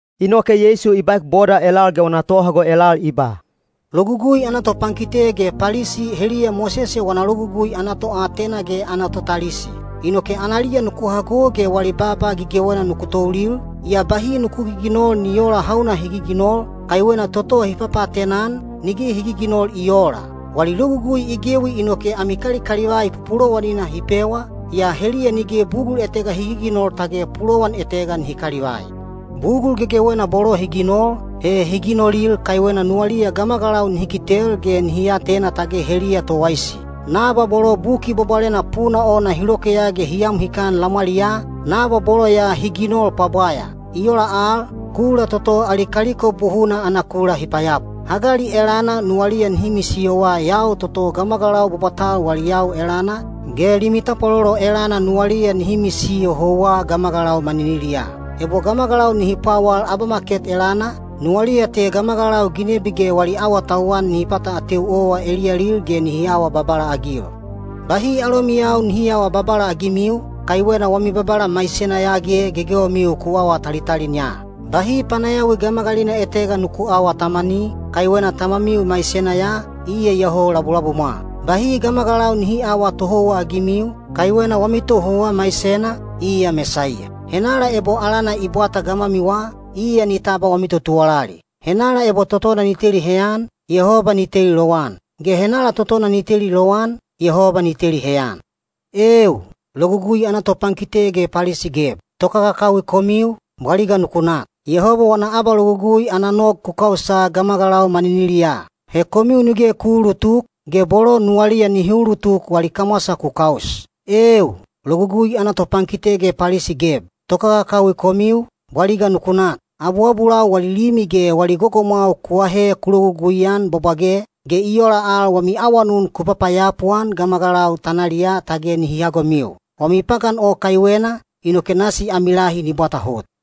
Inoke Yeisu i baek boda elal ge wana tohago elal i ba, “Logugui ana topankite ge Palisi heliya Mosese wana Logugui ana toatena ge ana totalisi. Inoke analiya nuku hago ge wali baaba gegewena nuku toulil, yaa bahi nuku giginol ni oola hauna hi giginol, kaiwena toto hi papaatena-an, nige hi giginol i oola. Wali logugui i gewi inoke ami kalikalivai pupulowanina hi pewa, yaa heliya nige bugul etega hi giginol tage pulowan etega nihi kalivai. Bugul gegewena bolo hi ginol, he hi ginolil kaiwena nuwaliya gamagalau nihi kitel ge nihi atena tage heliya towaisi. Nabwa bolo Buki Bwabwalena puna ona hi lokeya ge hi am hikan lamwaliyaa, nabwa bolo ya hi ginol pwabwaya. I ola al, kula toto ali kaliko buhuna ana kula hi payapu. Hagali elana nuwaliya nihi misiyowa yau toto gamagalau bwabwatal wali yau elana, ge limi tapwalolo elana nuwaliya nihi misiyo houwa gamagalau maniniliyaa. Ebo gamagalau nihi pwawal abamaket elana, nuwaliya te gamagalau ginebi ge wali awatauwan nihi pata ateu owa eliyalil ge nihi awa babala-agil. Bahi alomiyau nihi aawa babala-agimiu, kaiwena wami Babala maisena ya ge gegewemiu ku awa talitalin ya. Bahi panayawi gamagalina etega nuku aawa tamani, kaiwena Tamamiu maisena ya, iya iyoho labulabumwa. Bahi gamagalau nihi aawa tohouwa-agimiu, kaiwena wami tohouwa maisena, iya Mesaiya. Henala ebo alana i bwata gamwamiwa, iya ni tabwa wami totuwalali. Henala ebo totona ni teli heyan, Yehoba ni teli lowan, ge henala totona ni teli lowan, Yehoba ni teli heyan. Eeu, Logugui ana topankite ge Palisi geb! Tokakakawi komiu, bwaliga nuku nak! Yehoba wana abalogugui ana nog ku kausa gamagalau maniniliyaa. He komiu nige ku uulutuk, ge bolo nuwaliya nihi ulutuk wali kamwasa ku kaus. Eeu, Logugui ana topankite ge Palisi geb! Tokakakawi komiu, bwaliga nuku nak! Abuabulau wali limi ge wali gogomwau ku aahe ku lologugui-an bwabwage, ge i ola al wami awanun ku papayapu-an gamagalau tanaliyaa tage nihi hagomiu. Wami pagan o kaiwena, inoke nasi ami lahi ni bwata hot.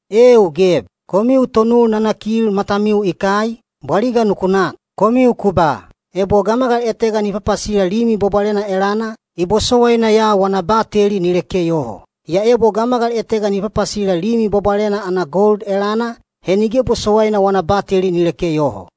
Eeu geb! Komiu tonul nanakil matamiu i kai, bwaliga nuku nak! Komiu ku ba, ‘Ebo gamagal etega ni papasila Limi Bwabwalena elana, i bosowaina ya wana bateli ni leke yoho; yaa ebo gamagal etega ni papasila Limi Bwabwalena ana gold elana, he nige bosowaina wana bateli ni leke yoho.’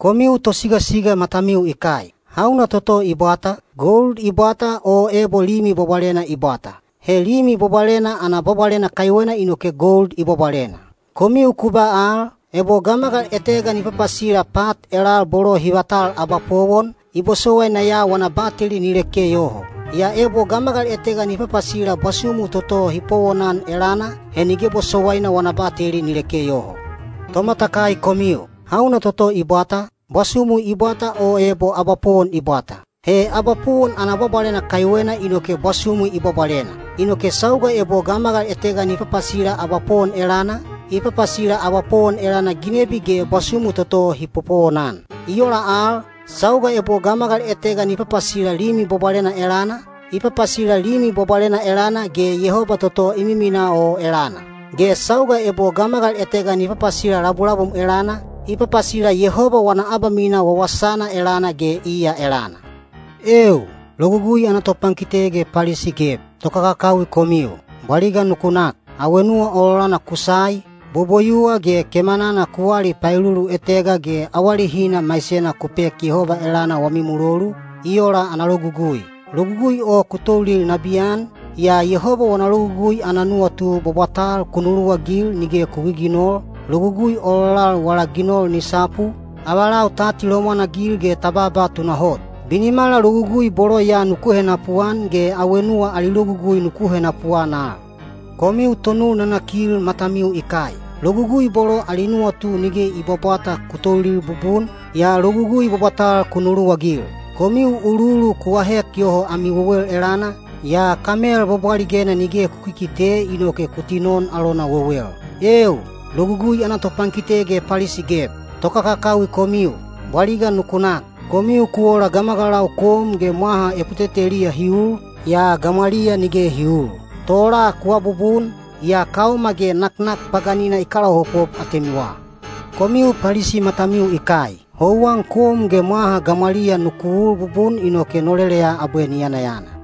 Komiu tosigasiga matamiu i kai. Hauna toto i bwata, gold i bwata o ebo Limi Bwabwalena i bwata? He Limi Bwabwalena ana bwabwalena kaiwena inoke gold i bwabwalena. Komiu ku ba al, ‘Ebo gamagal etega ni papasila pat elal bolo hi vatal abapowon, i bosowaina ya wana bateli ni leke yoho; yaa ebo gamagal etega ni papasila bwasumu toto hi popowonan elana, he nige bosowaina wana bateli ni leke yoho.’ Tomatakai komiu! Hauna toto i bwata, bwasumu i bwata o ebo abapowon i bwata? He abapowon ana bwabwalena kaiwena inoke bwasumu i bwabwalena. Inoke sauga ebo gamagal etega ni papasila abapowon elana, i papasila abapowon elana ginebi ge bwasumu toto hi popowonan. I ola al, sauga ebo gamagal etega ni papasila Limi Bwabwalena elana, i papasila Limi Bwabwalena elana ge Yehoba toto i miminaa o elana. Ge sauga ebo gamagal etega ni papasila labulabum elana, i papasila Yehoba wana abamisiyo wawasana elana ge iya elana. Eeu, Logugui ana topankite ge Palisi geb! Tokakakawi komiu, bwaliga nuku nak. Awenuwa ololana kusai, boboyuwa ge kemanana ku wali paelulutega ge wali maisena ku pek Yehoba elana wami mulolu, i ola ana logugui. Logugui o ku toulil nabiyan, yaa Yehoba wana logugui ana nuwatu bwabwatal ku nuluwagil nige ku giginol, logugui ololal wala ginol ni sapu, avalau ta atilomwan-agil ge ta baaba tunahot. Binimala logugui bolo ya nuku henapuan ge awenuwa ali logugui nuku henapuan al. Komiu tonul nanakil matamiu i kai! Logugui bolo ali nuwatu nige i bwabwata ku toulil bubun, yaa logugui bwabwatal ku nuluwagil. Komiu uluulu ku ahek yoho ami wewel elana, yaa kamel bwabwaligena nige ku kikite inoke ku tinon alona wewel. Eeu, Logugui ana topankite ge Palisi geb! Tokakakawi komiu, bwaliga nuku nak! Komiu ku ola gamagalau kom ge mwaha eputeteliya hi ul, yaa gamwaliya nige hi uul. Tola ku abubun, yaa kaoma ge naknak paganina i kalaopop atemiwa. Komiu Palisi matamiu i kai! Houwan kom ge mwaha gamwaliya nuku ul bubun inoke noleleya abwe ni yanayana.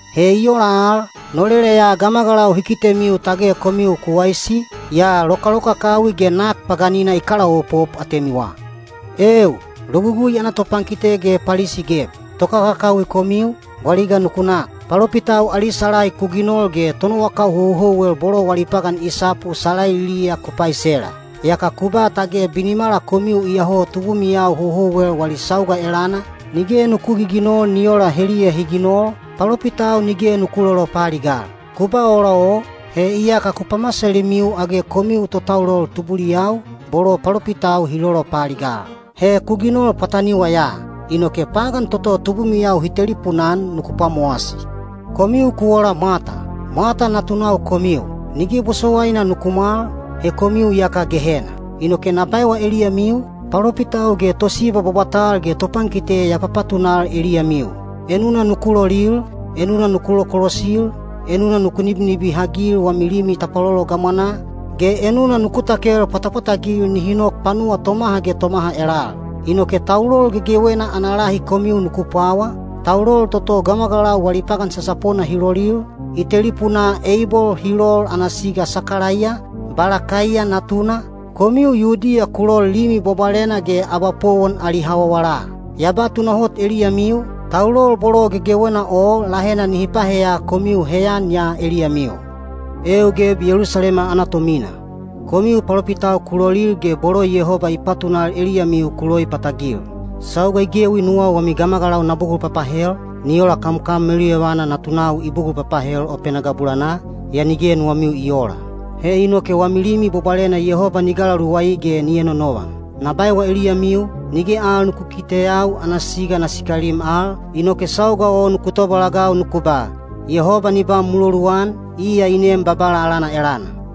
He i ola al, noleleya gamagalau hi kitemiu tage komiu ku waisi, yaa lokalokakawi ge nak paganina i kalaopop atemiwa. Eeu, Logugui ana topankite ge Palisi geb! Tokakakawi komiu, bwaliga nuku nak! Palopitau ali salai ku ginol ge tonowakau houhouwel bolo wali pagan i sapu salailiya ku paisela. Yaka ku ba tage binimala komiu iyoho tubumiyau houhouwel wali sauga elana, nige nuku giginol ni ola heliya hi ginol, palopitau nige nuku lolopaaligal. Ku ba ola o, he iyaka ku pamasalimiu age komiu totaulol tubuliyau, bolo palopitau hi lolopaaligal. He ku ginol pwataniwa ya! Inoke pagan toto tubumiyau hi telipuna-an nuku pwamowasi! Komiu ku ola mwata! Mwata natunau komiu! Nige bosowaina nuku mwal, he komiu iyaka Gehena. Inoke na baewa eliyamiu, palopitau ge tosiba bwabwatal ge topankite ya papatunal eliyamiu. Enuna nuku lolil, enuna nuku lokolosil, enuna nuku nibinibihagil wami limi tapwalolo gamwanaa, ge enuna nuku takel pwatapwatagil nihi nok panuwa tomaha ge tomaha elal. Inoke taulol gegewena ana lahi komiu nuku pwawa, taulol toto gamagalau wali pagan sasapona hi lolil, i telipunaa Eibol hi lol ana siga Sakalaiya, Balakaiya natuna, komiu Yudiya ku lol Limi Bwabwalena ge abapowon ali hawawala. Ya ba tunahot eliyamiu, taulol bolo gegewena o lahena nihi paheya komiu heyan ya eliyamiu. Eeu geb Yelusalema ana tomina! Komiu palopitau ku lolil ge bolo Yehoba i patunal eliyamiu ku loipatagil. Sauga i gewi nuwau wami gamagalau na bugul papahel, ni ola kamkam meluyovana natunau i bugul papahel opena gabulanaa, yaa nige nuwamiu i oola. He inoke wami Limi Bwabwalena Yehoba ni galaluwai ge ni enonovan. Na baewa eliyamiu, nige al nuku kikiteyau ana siga na sikalim al, inoke sauga o nuku tobalagau nuku ba, ‘Yehoba ni ba muloluan, iya i nem Babala alana elana!’”